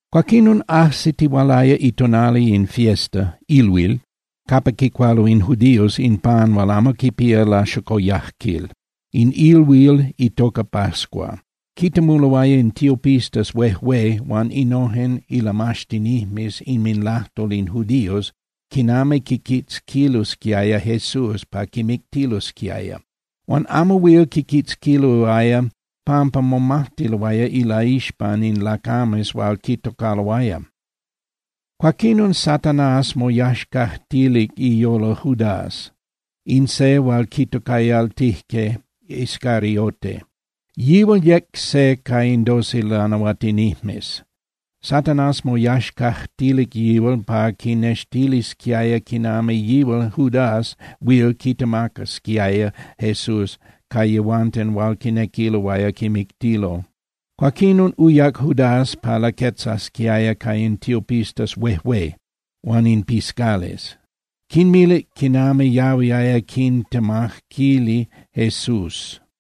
Cuaquinon ajsitihualaya itonali in fiesta (ilhuil) capa quicualo in judíos in pan hual amo quipía laxocoyajquil, in ilhuil itoca Pascua. Quitemuloaya in tiopistas huejué huan innojen ilamaxtinijmes inminlajtol in judíos quinami quiquitzquilosquiaya Jesús pa quimictilosquiaya. Huan amo huil quiquitzquiloaya pampa momajtiloaya laixpan in lacames hual quitocaloaya. Cuaquinon Satanás moyaxcajtilic iyolo Judás, in se hual quitocayaltijque Iscariote. Yihual yec se ca in doce lanahuatinijmes. Satanás moyaxcajtilic yihual pa quinextilisquiaya quinami yihual Judás huil quitemacasquiaya Jesús ca yehuanten hual quinequiloaya quimictilo. Cuaquinon uyac Judás pa laquetzasquiaya ca in tiopistas huejué huan in piscales, quinmilic quinami yahuiaya quintemaquili Jesús.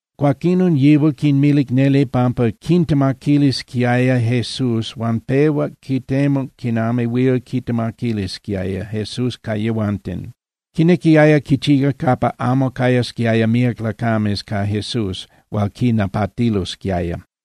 Cuaquinon yihual quinmilic neli pampa quintemaquilisquiaya Jesús, huan pehuac quitemuc quinami huil quitemaquilisquiaya Jesús ca yehuanten. Quinequiaya quichía capa amo cayasquiaya míac lacames ca Jesús hual quinapatilosquiaya.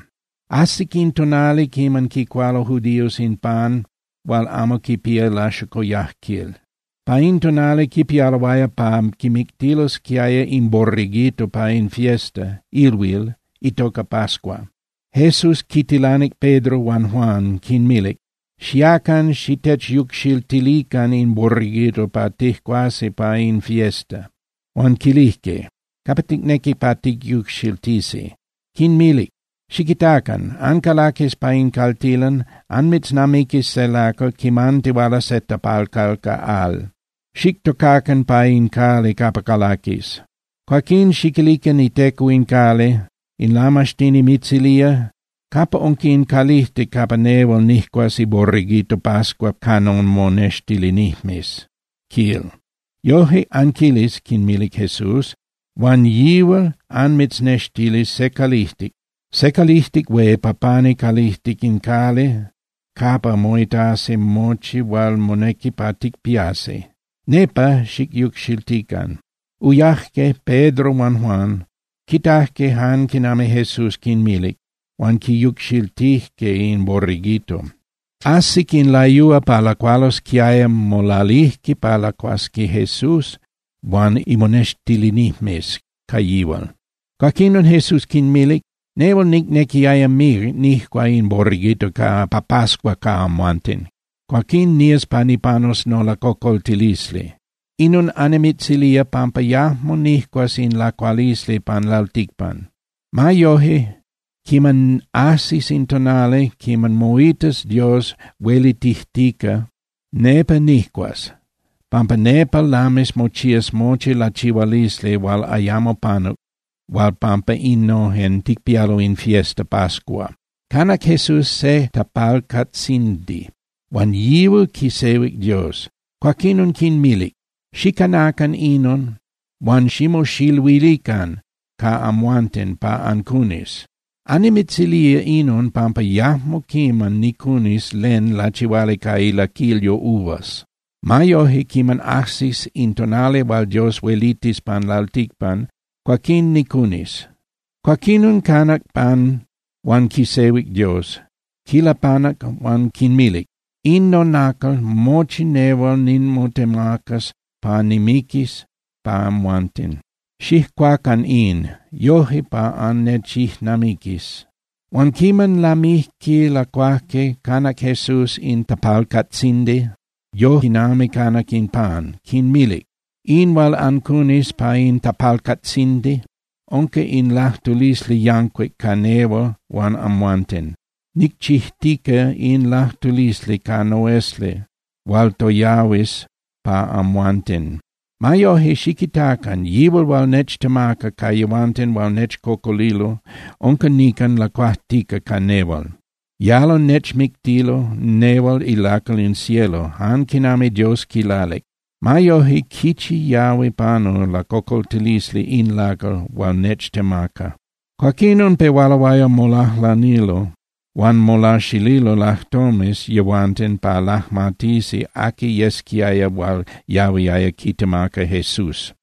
Ajsic in tonali quiman quicualo judíos in pan hual amo quipía laxocoyajquil. Pa in tonali quipialoaya pa quimictilosquiaya in borreguito pa in fiesta (ilhuil) itoca Pascua. Jesús quintilanic Pedro huan Juan, quinmilic: —Xiacan xitechyucxiltilican in borreguito pa tijcuasi pa in fiesta. Huan quilijque: —¿Capa ticnequi pa ticyucxiltisi? Quinmilic: —Xiquitacan. Ancalaquis pa in caltilan, anmitznamiquis se lacal quimantihuala se tapalcal ca al. Xictocacan pa in cali capa calaquis. Cuaquín xiquilican iteco in cali: “In Lamaxtini mitzilía: ¿Capa unca in calijtic capa nehual nijcuas iborreguito Pascua ca nomonextilinijmes?”, quil. Yoje anquilis —quinmilic Jesús—, huan yihual anmitznextilis se calijtic hué pa pani calijtic in cali capa moitasi mochi hual monequi pa ticpiasi. Nepa xicyucxiltican. Uyaje Pedro huan Juan, quitajque jan quinami Jesús quinmilic, huan quiyucxiltijque in borreguito. Ajsic in layúa pa lacualosquiaya, molalijque pa lacuasqui Jesús huan imonextilinijmes ca yihual. Cuaquinon Jesús quinmilic: —¡Nehual nicnequiaya míac nijcua in borreguito pa pascua ca amhuanten! Cuaquín nías pa nipanus nolacocoltilisli. Inon annimitzilía pampa yajmo nijcuas in lacualisli pan lalticpan. Ma yoje, quiman ajsis in tonali quiman moitas Dios huelitijtica, nepa nijcuas, pampa nepa lamis mochías mochi lachihualisli hual ayamo panuc hual pampa innojen ticpialo in fiesta Pascua. Quimacajque Jesús se tapalcatzindi huan yihual quisehuic Dios, cuaquinon quinmilic: —Xicanacan inon huan ximoxiluilican ca amhuanten pa ancunis. Annimitzilía inon pampa yajmo quiman nicunis len lachihuali ca ilaquilyo uvas. Ma yoje, quiman ajsis in tonali hual Dios huelitis pan lalticpan, cuaquín nicunis. Cuaquinon canac pan huan quisehuic Dios, quilapanac huan quinmacac, quinmilic: —In nonacal, mochi nehual nimotemacas pa nimiquis pa amhuanten. Xijcuacan in, yoje pa annechijnamiquis. Huan quiman lamijque lacuajque, canac Jesús in tapalcatzindi yoje quinami canac in pan, quinmilic: —In hual ancunis pa in tapalcatzindi unca in lajtulisli yancuic ca nehual huan amhuanten. Nicchijtica in lajtulisli ca noesli hual toyahuis pa amhuanten. Ma yoje, xiquitacan. Yihual hual nechtemaca ca yehuanten hual nechcocolilo unca nican lacuajtica ca nehual. Yalo nechmictilo nehual ilacal in cielo jan quinami Dios quilalic. Ma yoje ¡quichi yahui panu lacocoltilisli in lacal hual nechtemaca! Cuaquinon pehualoaya molajlanilo huan molaxililo lajtomes yehuanten pa lajmatisi aqui yesquiaya hual yahuiaya quitemaca Jesús.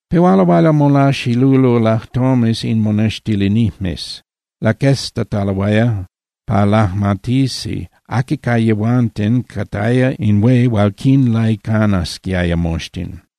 Pehualoaya molaxililo lajtomes in monextilinijmes, laqueztataloaya pa lajmatisqui aqui ca yehuanten cataya in hué hual quinlaicanasquiaya moxtin.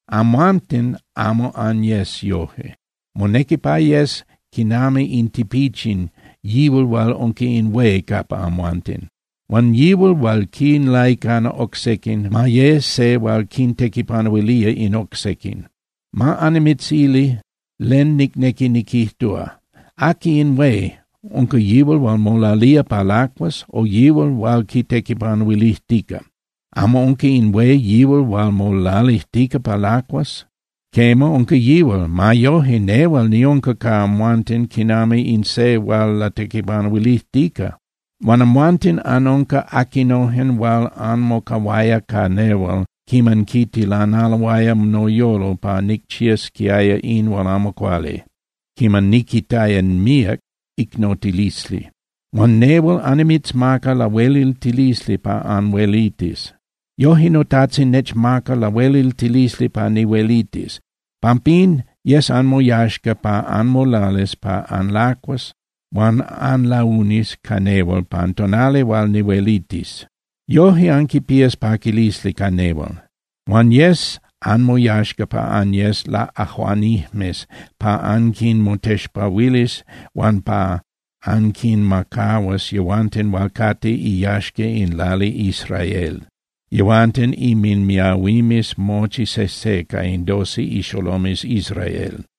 Amhuanten amo anyes yoje. Monequi pa yes quinami in tipichin yihual hual unca in hué capa amhuanten. Huan yihual hual quinlaicana oc sequin ma ye se hual quintequipanuilía in oc sequin. Ma annimitzili len nicnequi niquijtúa. ¿Aqui in hué? ¿Unca yihual hual molalía pa lacuas, o yihual hual quitequipanuilijtica? ¿Amo unca in hué yihual hual molalijtica pa lacuas? Quema, unca yihual. Ma yoje, nehual niunca ca amhuanten quinami in se hual latequipanuilijtica. Huan amhuanten anunca aquinojen hual anmocahuaya ca nehual quiman quitilanaloaya noyolo pa nicchiasquiaya in hual amo cuali, quiman niquitaya míac icnotilisli. Huan nehual annimitzmaca lahueliltilisli pa anhuelitis. Yoje noTajtzin nechmacac lahueliltilisli pa nihuelitis. Pampín yes anmoyaxca pa anmolalis pa anlacuas huan anlaunis ca nehual pan tonali hual nihuelitis. Yoje anquipías paquilisli ca nehual. Huan yes anmoyaxca pa anyes laꞌajuanijmes pa anquinmotexpahuilis huan pa anquinmacahuas yehuanten hual cate iyaxca in lali Israel, yehuanten inminmiahuimes mochi sejse ca in doce ixolomes Israel.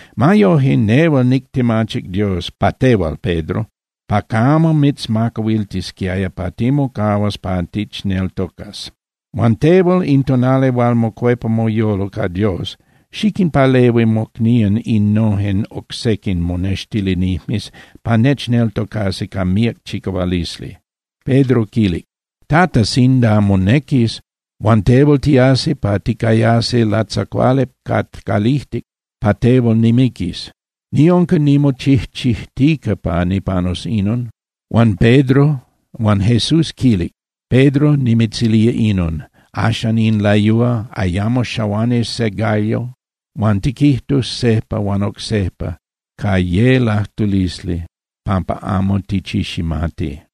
Ma yoje, nehual nictemachic Dios pa tehual, Pedro, pa camo mitzmacahuiltisquiaya pa timocahuas pa tichneltocas. Huan tehual, in tonali hual mocuepa moyolo ca Dios, xiquinpalehui mocnían innojen oc sequin monextilinijmes pa nechneltocasi ca míac chicahualisli. Pedro quilic: —Tata, sinda monequis, huan tehual tiasi pa ticayasi latzacuali ca calijtic, pa tehual nimiquis. Niunca nimochijchijtica pa nipanus inon. Huan Jesús quilic: —Pedro, nimitzilía inon: Axan in layúa, ayamo xahuanis se gallo huan tiquijtus sejpa huan oc sejpa ca ye lajtulisli pampa amo tichiximati.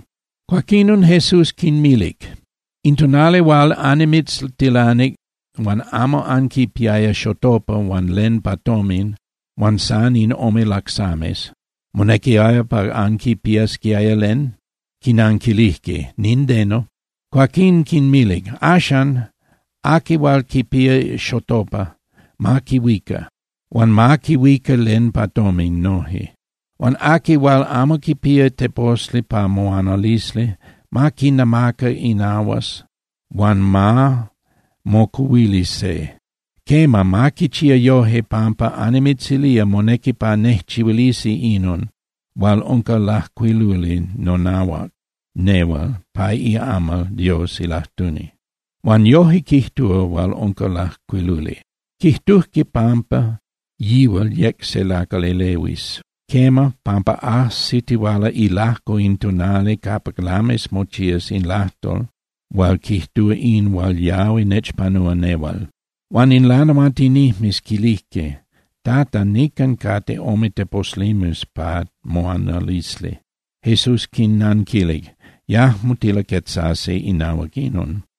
Cuaquinon Jesús quinmilic: —In tonali hual annimitztilanic huan amo anquipiaya xotopa huan len pa tomin, huan san in ome lacsames, ¿monequiaya pa anquipiasquiaya len? Quinanquilijque: —Nindeno. Cuaquín quinmilic: —Axan, aqui hual quipía xotopa, ma quihuica, huan ma quihuica len pa tomin noje. Huan aqui hual amo quipía teposli pa moanalisli, ma quinamaca inahuas huan ma mocuhuili se. Quema, ma quichía yoje pampa annimitzilía monequi pa nejchihuilisi inon hual unca lajcuiluli nonahuac nehual pa iamal Dios ilajtuni. Huan yoje quijtúa hual unca lajcuiluli: “Quijtujque pampa yihual yec se lacal elehuis.” Quema, pampa ajsitihuala ilajco in tonali capa lamis mochías in lajtol hual quijtúa in hual yahui nechpanúa nehual. Huan in lanahuatinijmes quilijque: —Tata, nican cate ome teposlimes pa moanalisli. Jesús quinnanquilic: —Yajmo tilaquetzasi inahuac inon.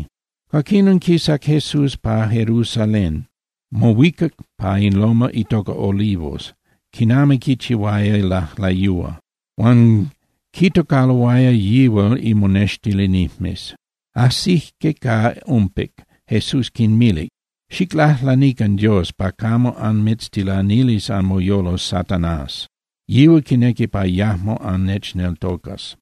Cuaquinon quisac Jesús pa Jerusalén, mohuicac pa in loma itoca Olivos, quinami quichihuaya lajlayúa. Huan quitocaloaya yihual imonextilinijmes. Ajsijque ca umpic, Jesús quinmilic: —Xiclajlanican Dios pa camo anmitztilanilis anmoyolo Satanás. Yihual quinequi pa yajmo annechneltocas.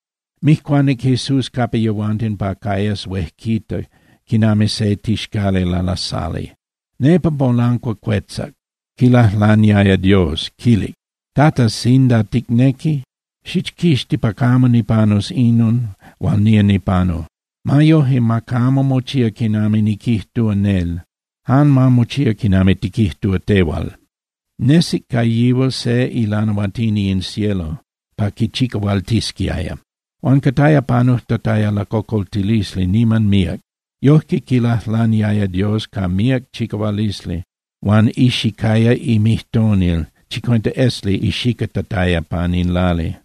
Mijcuanic Jesús capa yehuanten pa cayas huejquita quinami se tixcali lalasali. Nepa molancuacuetzac, quilajlaniaya Dios, quilic: —Tata, sinda ticnequi, xichquixti pa camo nipanus inon hual nía nipanu. Ma yoje, ma camo mochía quinami niquijtúa nel, jan ma mochía quinami tiquijtúa tehual. Nesic ca yihual se ilanahuatini in cielo pa quichicahualtisquiaya. Huan cataya panujtataya lacocoltilisli niman míac. Yojque quilajlaniaya Dios ca míac chicahualisli, huan ixicaya imijtonil chicuenta esli ixicatataya pan in lali.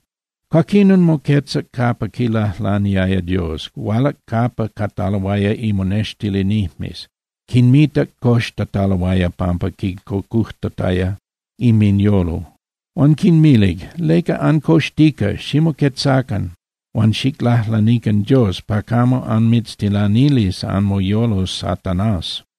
Cuaquinon moquetzac capa quilajlaniaya Dios, hualac capa cataloaya imonextilinijmes, quinmitac coxtataloaya pampa quincocujtataya inminyolo. Huan quinmilic: —¿Leca ancoxtica? Ximoquetzacan huan xiclajlanican Dios pa camo anmitztilanilis anmoyolo Satanás.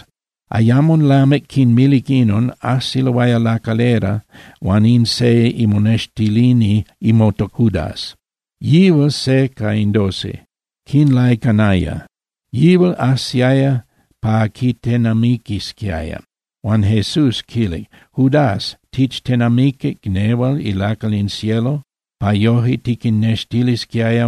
Ayamo lamic quinmilic inon, ajsiloaya lacalera huan in se imonextilini motocaya Judas, yihual se ca in doce, quinlaicanaya. Yihual ajsiaya pa quitenamiquisquiaya. Huan Jesús quilic: —Judas, ¿tichtenamiquic nehual ilacal in cielo, pa yoje tiquinnextilisquiaya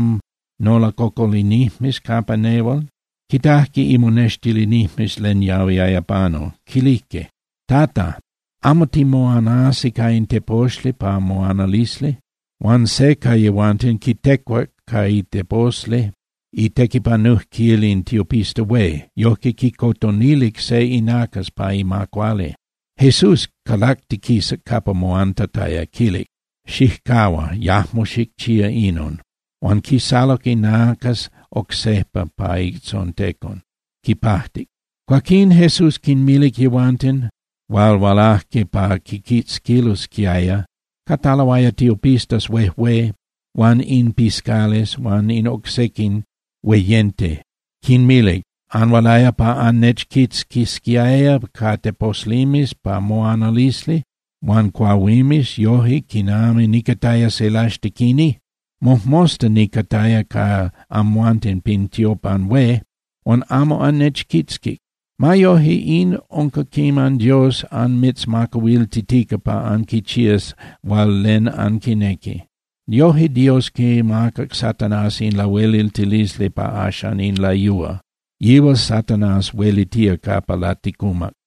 nolacocolinijmes capa nel? Quitajque imonextilinijmes len yahuiaya panu, quilijque: —Tata, ¿amo timoanasi ca in teposli pa moanalisli? Huan se ca yehuanten quitecuac ca iteposli itequipanujquil in tiopista hué, yojque quicotonilic se inacas pa ima cuali. Jesús calactiquisac capa moantataya, quilic: —Xijcahua, yajmo xicchía inon. Huan quisaluc inacas oc sejpa pa itzontecon, quipajtic. Cuaquín Jesús quinmilic yehuanten hual hualajque pa quiquitzquilosquiaya, cataloaya tiopistas huejué huan in piscales huan in oc sequin hueyente, quinmilic: —¿Anhualaya pa annechquitzquisquiaya ca teposlimes pa moanalisli huan cuahuimes yoje quinami nicataya se laxtequini? Mojmosta nicataya ca amhuanten pin tiopan hué, huan amo annechquitzquic. Ma yoje, in unca quiman Dios anmitzmacahuiltitica pa anquichías hual len anquinequi. Noje Dios quimacac Satanás in lahueliltilisli pa axan in layúa, yihual Satanás huelitía capa laticumac.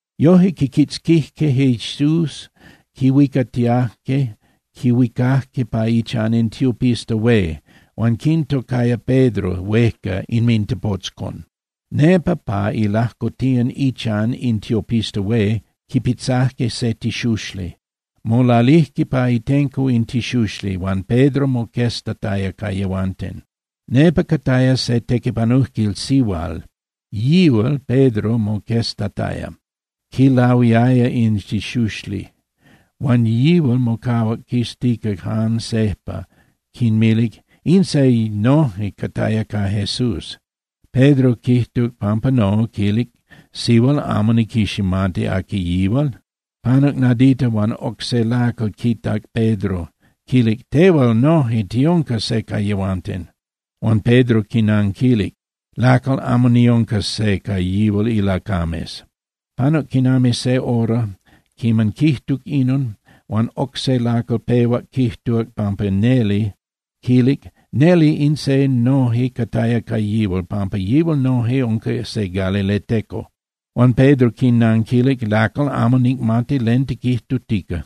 Yoje quiquitzquijque Jesús, quihuicatiajque, quihuicajque pa ichan in tiopista hué. Huan quintocaya Pedro huejca inmintepotzcon. Nepa pa ilajcotiyan ichan in tiopista hué quipitzajque se tixuxli. Molalijque pa itenco in tixuxli, huan Pedro moqueztataya ca yehuanten. Nepa cataya se tequipanujquil sihual, quitac Pedro moqueztataya, quilahuiaya in tixuxli. Huan yihual mocahuac quiztica jan sejpa, quinmilic: —In se noje cataya ca Jesús. Pedro quijtuc pampa no, quilic: —Sihual, amo niquiximati aqui yihual. Panuc nadita huan oc se lacal quitac Pedro, quilic: —Tehual noje tiunca se ca yehuanten. Huan Pedro quinanquilic: —Lacal, amo niunca se ca yihual ilacames. Panuc quinami se hora quiman quijtuc inon, huan oc se lacal pehuac quijtuc pampa neli, quilic: —Neli in se noje cataya ca yihual, pampa yihual noje unca se galileteco. Huan Pedro quinanquilic: —Lacal, amo nicmati len tiquijtutica.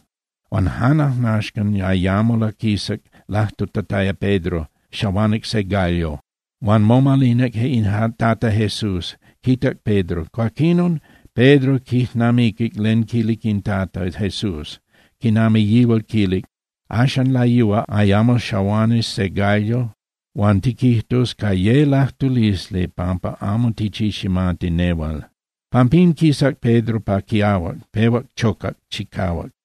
Huan jan ajnaxcan, ayamo laquisac lajtutataya Pedro, xahuanic se gallo. Huan momalinac in Tata Jesús, quitac Pedro. Cuaquinon Pedro quijnamiquic len quilic in Tata Jesús, quinami yihual quilic: “Axan layúa ayamo xahuanis se gallo huan tiquijtus ca ye lajtulisli pampa amo tichiximati nehual.” Pampín quisac Pedro pa quiahuac, pehuac chocac chicahuac.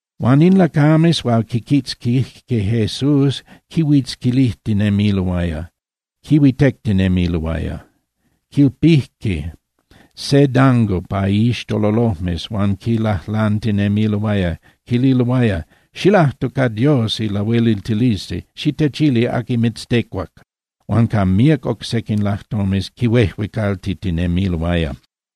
Huan in lacames hual quiquitzquijque Jesús quihuitzquilijtinemiloaya, quihuitectinemiloaya. Quilpijque se dango pa iixtololojmes huan quilajlantinemiloaya, quililoaya: —¡Xilajtu ca Dios ilahueliltilisli, xitechili aqui mitztecuac! Huan ca míac oc sequin lajtomes quihuejuecaltitinemiloaya.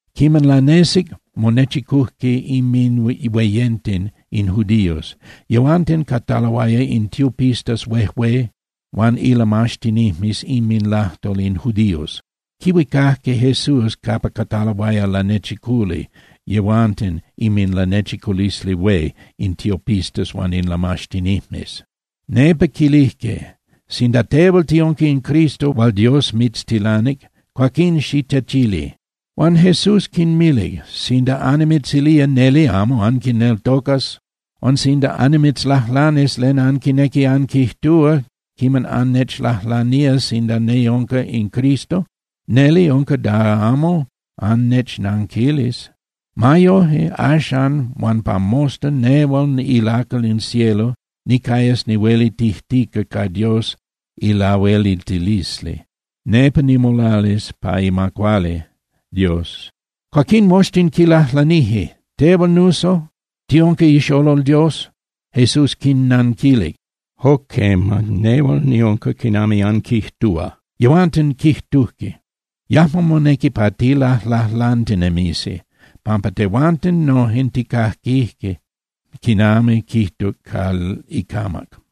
Quiman lanesic, monechicujque inminhueyente in judíos. Yehuanten cataloaya in tiopistas huejué huan ilamaxtinijmes inminlajtol in judíos. Quihuicajque Jesús capa cataloaya lanechiculi yehuanten inminLanechiculisli Hué in tiopistas huan in lamaxtinijmes. Nepa quilijque: —Sinda tehual tiunca in Cristo hual Dios mitztilanic, cuaquín xitechili. Huan Jesús quinmilic: —Sinda annimitzilía, neli amo anquineltocas. Huan sinda annimitzlajlanis len anquinequi anquijtúa quiman annechlajlanía sinda niunca in Cristo, neli unca da amo annechnanquilis. Ma yoje, axan huan pa mosta nehual ilacal in cielo nicayas nihuelitijtica ca Dios ilahueliltilisli, nepa nimolalis pa ima cuali Dios. Cuaquín moxtin quilajlanijque: —Tehual nuso, ¿tiunca ixolol Dios? Jesús quinnanquilic: —Jo quema, nehual niunca quinami anquijtúa. Yehuanten quijtujque: —¡Yajmo monequi pa tilajlajlantinemisi, pampa tehuanten nojen tijcaquije quinami quijtuc ca icamac!